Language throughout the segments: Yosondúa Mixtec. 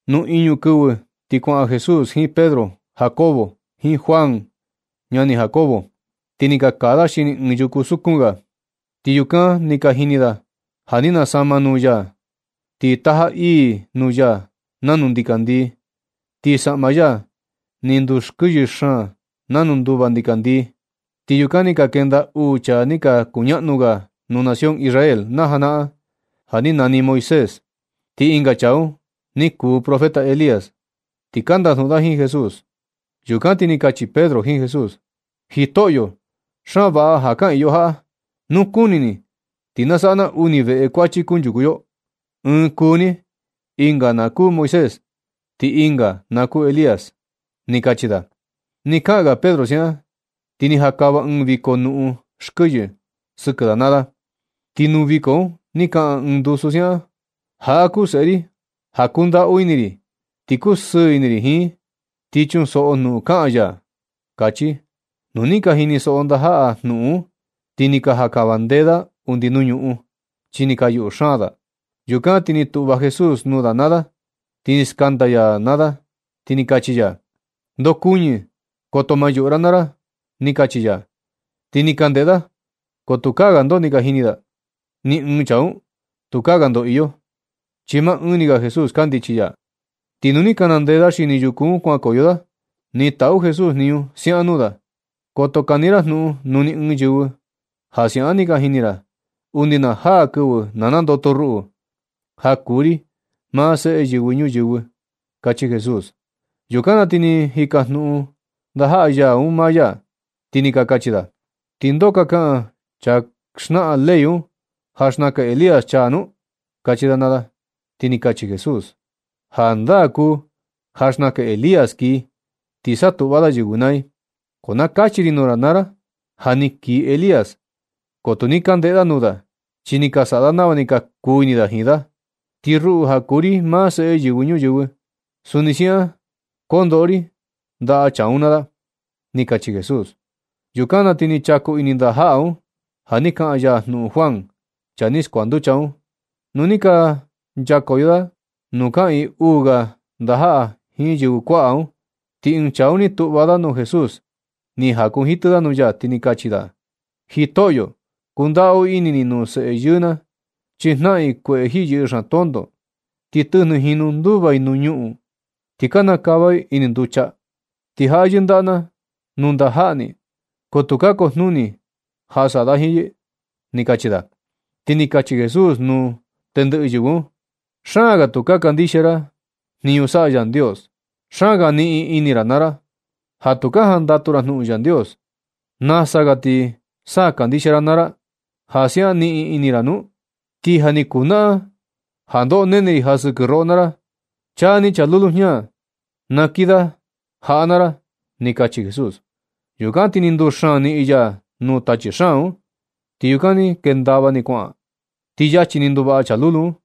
Nu iñu kɨvɨ ti kuaꞌan Jesús jiin Pedro, Jacobo, jiin Juan ñani Jacobo, ti ni ka kaa da xini ɨɨn yuku sukun ga. Ti yukan ni ka jini da ja ni nasama nuu ya. Ti taja ii nuu ya nanu ndikandii, ti saꞌma ya ni ndukɨyɨ xaan nanu nduva ndikandii. Ti yukan ni ka ndenda uu chaa ni ka kuñaꞌnu ga nuu nación Israel na janaꞌan ni nani Moisés, ti ɨnga chaa un ni kuu profeta Elías, ti ka ndajnuꞌun da jiin Jesús. Yukan ti ni kachi Pedro jiin Jesús: ―Jitoꞌyo, xaan vaꞌa ja kaꞌiin yo jaꞌa. Nu kuni ni ti na saꞌa na uni veꞌe kuachi kunchuku yo, ɨɨn kuu ni, ɨnga na kuu Moisés, ti ɨnga na kuu Elías ―ni kachi da. Nɨ kaꞌan ga Pedro siaꞌan, ti ni jakava ɨɨn viko nuꞌun xkɨyɨ sɨkɨ da naa da. Ti nuu viko un ni kaꞌan ɨɨn ndusu siaꞌan: ―Jaꞌa kuu Seꞌe ri ja kundaꞌu ini ri, ti kusɨɨ ini ri jiin. Ti chunsoꞌo jnuꞌun kaꞌan ya ―kachi. Nu ni ka jinisoꞌo ndajaꞌa ya jnuꞌun un, ti ni ka jankava ndee da undi nuu ñuꞌun, chi ni ka yuꞌu xaan da. Yukan ti ni tuꞌva Jesús nuu da naa da, ni skanda ya da, ti ni kachi ya: ―Ndokuñɨ, koto ma yuꞌu ra naa ra ―ni kachi ya. Ti ni ka ndeꞌe da, ko tukaa ga ndoo ni ka jini da, ni ɨɨn chaa un. Tukaa ga ndoo iyo, chi maa ɨɨn ni ga Jesús kandichi ya. Ti nu ni ka nandee da xini yuku un kuankoyo da, ni taꞌu Jesús jniñu siaꞌan nuu da: ―Koto kani ra jnuꞌun nuu ni ɨɨn yɨvɨ ja siaꞌan ni ka jini ra, undi na jaa kɨvɨ na nandoto ruꞌu, ja kuu ri maa Seꞌe Yɨvɨ Ñuyɨvɨ ―kachi Jesús. Yukan na ti ni ka jikajnuꞌun ndajaꞌa ya un maa ya, ti ni ka kachi da: ―¿Ti ndoo ka kaꞌan chaa ka xnaꞌan ley un, ja xnakan Elías chaa nu? ―kachi da naa da. Ti ni kachi Jesús: ―Jandaa kuu ja xnaka Elías kii, ti satuꞌva da yɨvɨ naa i, ko na kachi ri nuu ra ja, ja ni kii Elías, ko tu ni ka ndeꞌe da nuu da, chi ni ka saꞌa da nava ni ka kuu ini da jiin da. Ti ruꞌu, ja kuu ri maa Seꞌe Yɨvɨ Ñuyɨvɨ, suni siaꞌan kondoꞌo ri ndaꞌa chaa un naa da ―ni kachi Jesús. Yukan ti ni ka chaku ini ndajaꞌa un ja ni kaꞌan ya jnuꞌun Juan, chaa ni skuanducha un. Nu ni ka nchakoyo da nuu kaꞌiin uu ga ndajaꞌa jiin yɨvɨ kuaꞌa un, ti ɨɨn chaa un ni tuꞌva da nuu Jesús, ni jakunjitɨ da nuu ya, ti ni kachi da: ―Jitoꞌyo, kundaꞌu ini ni nuu seꞌe yɨɨ na, chi jnaꞌan i kueꞌe jiꞌi yɨꞌɨ xaan tonto. Ti tɨjnɨ jinu nduva i nuu ñuꞌun, ti kana kava i ini nducha. Ti jaꞌa yɨndaꞌa na i nuu ndajaꞌa ni, ko tu ka kujnuni ja saꞌa da jiin yɨ ―ni kachi da. Ti ni kachi Jesús nuu tendɨꞌɨ yɨvɨ un: ―Xaan ga tu ka kandixia ra jniñu saꞌa Yandios. Xaan ga niꞌin ini ra naa ra ja tu ka jandatu ra nuu Yandios. ¿Nasa ga ti sa kandixia ra naa ra, ja siaꞌan niꞌin ini ra? Ti ja ni kujnaꞌan ja ndoꞌo nene ri ja sɨkɨ roꞌo naa ra. Chaan ni chaa lulu jña, na kii da jaꞌa naa ra ―ni kachi Jesús. Yukan ti ni nduxaan niꞌin ya nuu tachi xaan un, ti yukan ni kendava ni kuaꞌan. Ti yachi ni ni nduvaꞌa chaa lulu un.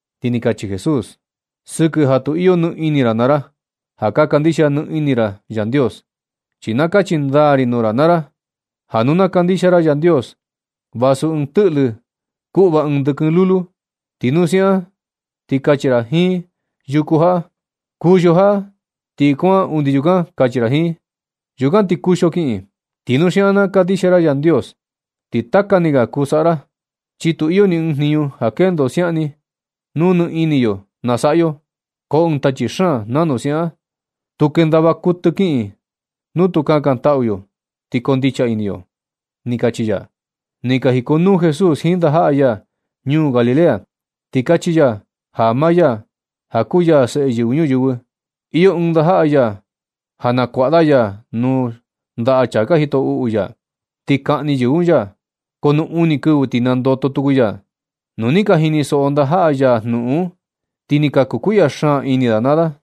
Ti ni kachi Jesús: ―Sɨkɨ ja tu ka iyo ni ini ra naa ra ja ka kandixia nɨ ini ra Yandios. Ti na kachi ndaa ri nuu ra naa ra, ja nu na kandixia ra Yandios, vasu ɨɨn tɨꞌlɨ, kuꞌva ɨɨn ndɨkɨn lulu, ti nu siaꞌan na, ti kachi ra jiin yuku jaꞌa: “Kuxio jaꞌa ti kuaꞌan undi yukan”, kachi ra jiin. Yukan ti kuxio kiꞌin. Ti nu siaꞌan na kandixia ra Yandios, ti taka ni ga kuu saꞌa ra, chi tu iyo ni ɨɨn jniñu ja kendo siaꞌan ni, nu nɨ ini yo na saꞌa yo. Ko ɨɨn tachi xaan nanu siaꞌan, tu kendava kutɨ kiꞌin nu tu kakantaꞌu yo, ti koo ndicha ini yo ―ni kachi ya. Nɨ ka jikonuu Jesús jiin ndajaꞌa ya ñuu Galilea, ti kachi ya ja maa ya, ja kuu ya Seꞌe Yɨvɨ Ñuyɨvɨ, iyo ɨɨn ndajaꞌa ya ja nakuaꞌa da ya nuu ndaꞌa chaa ka jito uꞌu ya. Ti kaꞌni yɨvɨ un ya, ko nu uni kɨvɨ ti nandoto tuku ya. Nu ni ka jinisoꞌo ndajaꞌa ya jnuꞌun un, ti ni ka kukuiꞌya xaan ini da naa da.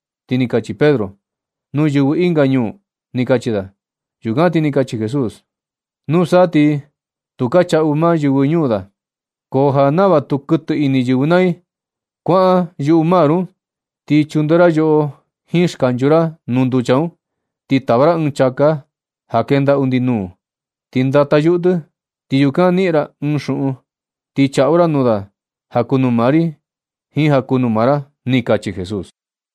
Ti ni kachi Pedro: ―Nuu yɨvɨ ɨnga ñuu ―ni kachi da. Yukan ti ni kachi Jesús: ―Nusa, ti tu ka chaꞌu maa yɨvɨ ñuu da. Ko ja nava tu kutɨ ini yɨvɨ naa i, kuaꞌan yuꞌu mar un, ti chunde ra yoꞌo jiin skanchu ra nuu nducha un, ti tava ra ɨɨn chāká ja kenda undi nuu un. Ti ndata yuꞌu tɨ, ti yukan niꞌin ra ɨɨn xuꞌun, ti chaꞌu ra nuu da ja kuu nuu maa ri, jiin ja kuu nuu maa ra ―ni kachi Jesús.